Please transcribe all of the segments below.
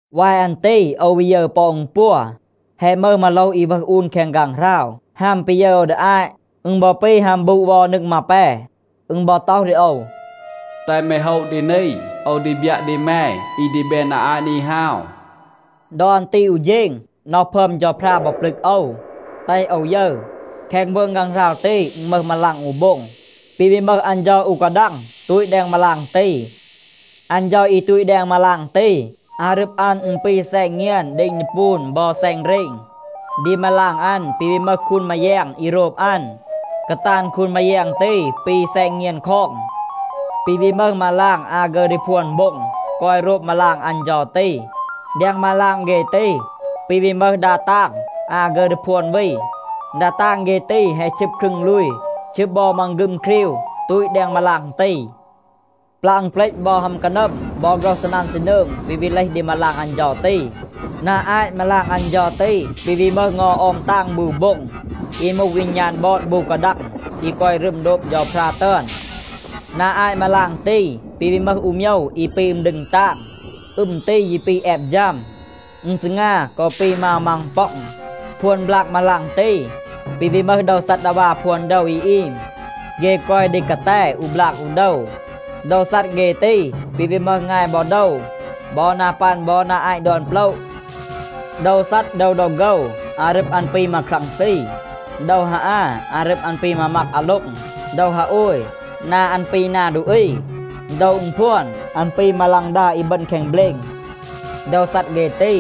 วาย อัน ตี โอว วี ยึร ปอ อึณ ปัว. แฮะ มึห มาโลห อี วึห อูน แคง ฆางหราว. ฮัม ปี ยึร โอว ดี อาต, อึณ บอ ปี ฮัม บูด เวา นึง มาแป. อึณ บอ ต็อห ดี โอว, “แตห แม โฮะ ดี นี, โอว ดี บยัะ ดี แม อี ดี แบน นา อาต นี ฮาว.” ดอ อัน ตี อู เฌณ, น็อห พึอม เฌาพรา บอ ปลึก โอว, แตห โอว ยึร. แคง มืง ฆางหราว ตี อึณ มึห มาลาง อู โบ็ง. ปี วี มึห อัน เฌา อู กาดัง ตูต แดง มาลาง ตี. อัน เฌา อี ตูต แดง มาลาง ตี, อารึบ อัน อึณ ปี แซณ เงียน เดณ ดีปูน บอ แซณ เรณ. ดี มาลาง อัน ปี วี มึห คูนมาแยง อี โรบ อัน. กาตาน คูนมาแยง ตี ปี แซณ เงียน คอง. ปี วี มึห มาลาง อา ฆึร ดี พวน โบ็ง, กอย โรบ มาลาง อัน เฌา ตี. แดง มาลาง เฆ ตี, ปี วี มึห ดา ตาง อา ฆึร ดี พวน วี. ดา ตาง เฆ ตี, แฮะ ชึบ ครึง ลูย, ชึบ บอ มังฆึม ครีว, ตูต แดง มาลาง ตี. ปลัะ อึณเปลต บอ ฮัม กานัม บอ โฆรห ซีนัน ซีนืง ปี วี เลห ดี มาลาง อัน เฌา ตี. นา อาต มาลาง อัน เฌา ตี, ปี วี มึห เงา ออม ตาง บู โบ็ง อี มูห วีณาน บอด บู กาดัง อี กอย รึม โดบ เฌาพรา ตึอน. นา อาต มาลาง ตี, ปี วี มึห อู โมยว อี ปี อึม ดึง ตาง. อึม ตี ยี ปี แอบ ฌัม. อึณ ซีงา กอ ปี มาว มังป็อง. พวน บลาก มาลาง ตี ปี วี มึห โดว ซัดดาวา พวน โดว อี อีม. เฆ กอย ดี กาแต อู บลาก อู โดว. โดว ซัด เฆ ตี, ปี วี มึห งาย บอ โดว, บอ นา ปัน บอ นา อาต ดอน โปละ. โดว ซัด โดว ดอ โฆว, อารึบ อัน ปี มาครังซี. โดว ฮาอา, อารึบ อัน ปี มามัก อาโล็ง. โดว ฮาโอย, นา อัน ปี นา ดูอี. โดว อึณพวน, อัน ปี มาฆลาง อี บึณ แคง เบลณ. โดว ซัด เฆ ตี,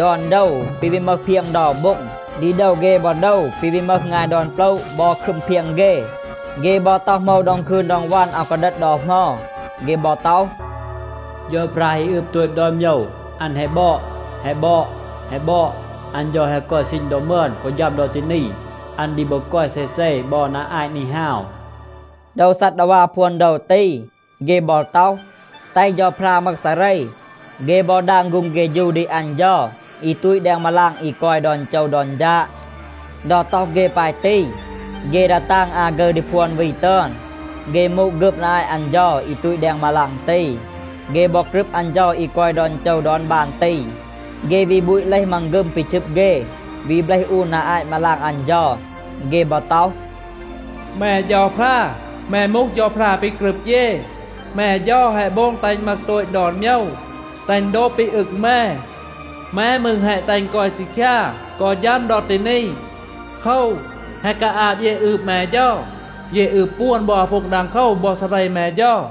ดอน โดว ปี วี มึห เพียง เดา โบ็ง. ดี โดว เฆ บอ โดว ปี วี มึห งาย ดอน โปละ บอ ครึม เพียง เฆ. เฆ บอ ต็อห โหมว ดอง คืน ดอง วัน, อาว กาดัด ดอ เหมา. เฆ บอ ต็อห, “เฌาพรา อี อึบ โตต ดอน โมยว, อัน แฮะ บอด, แฮะ บอด, แฮะ บอด. อัน เฌา แฮะ กอย ซีณ ดอ มึอน กอ ฌัม ดอ ตี นี. อัน ดี บอ กอย เซเซ บอ นา อาต นี ฮาว.” โดว ซัดดาวา พวน โดว ตี, เฆ บอ ต็อห, แตห เฌาพรา มึห ซาเร. เฆ บอ ดาง ฆูง เฆฌู ดี อัน เฌา อี ตูต แดง มาลาง อี กอย ดอน โจว ดอน ฌาด. ดอ ต็อห เฆ ปาย ตี, เฆ ดา ตาง อา ฆึร ดี พวน วี ตึอน, เฆ มูด ฆึบ นา อาต อัน เฌา อี ตูต แดง มาลาง ตี. เฆ บอ กรึบ อัน เฌา อี กอย ดอน โจว ดอน บาน ตี. เฆ วี บูต เลห มังฆึม ปี ชึบ เฆ, วี เบลห อูน นา อาต มาลาง อัน เฌา. เฆ บอ ต็อห, “แม เฌาพรา, แม มูห เฌาพรา ปี กรึบ เย. แม เฌา แฮะ โบง แตห อึณ มึห โตต ดอน โมยว, แตห อึณ โดบ ปี อึง แม. แม มืร แฮะ แตห อึณ กอย ซีคยา กอ ฌัม ดอ ตี นี. โคว, แฮะ กาอาบ เย อืบ แม เฌา. เย อืบ ปวน บอ อาพูง ดังโคว บอ ซาเร แม เฌา.”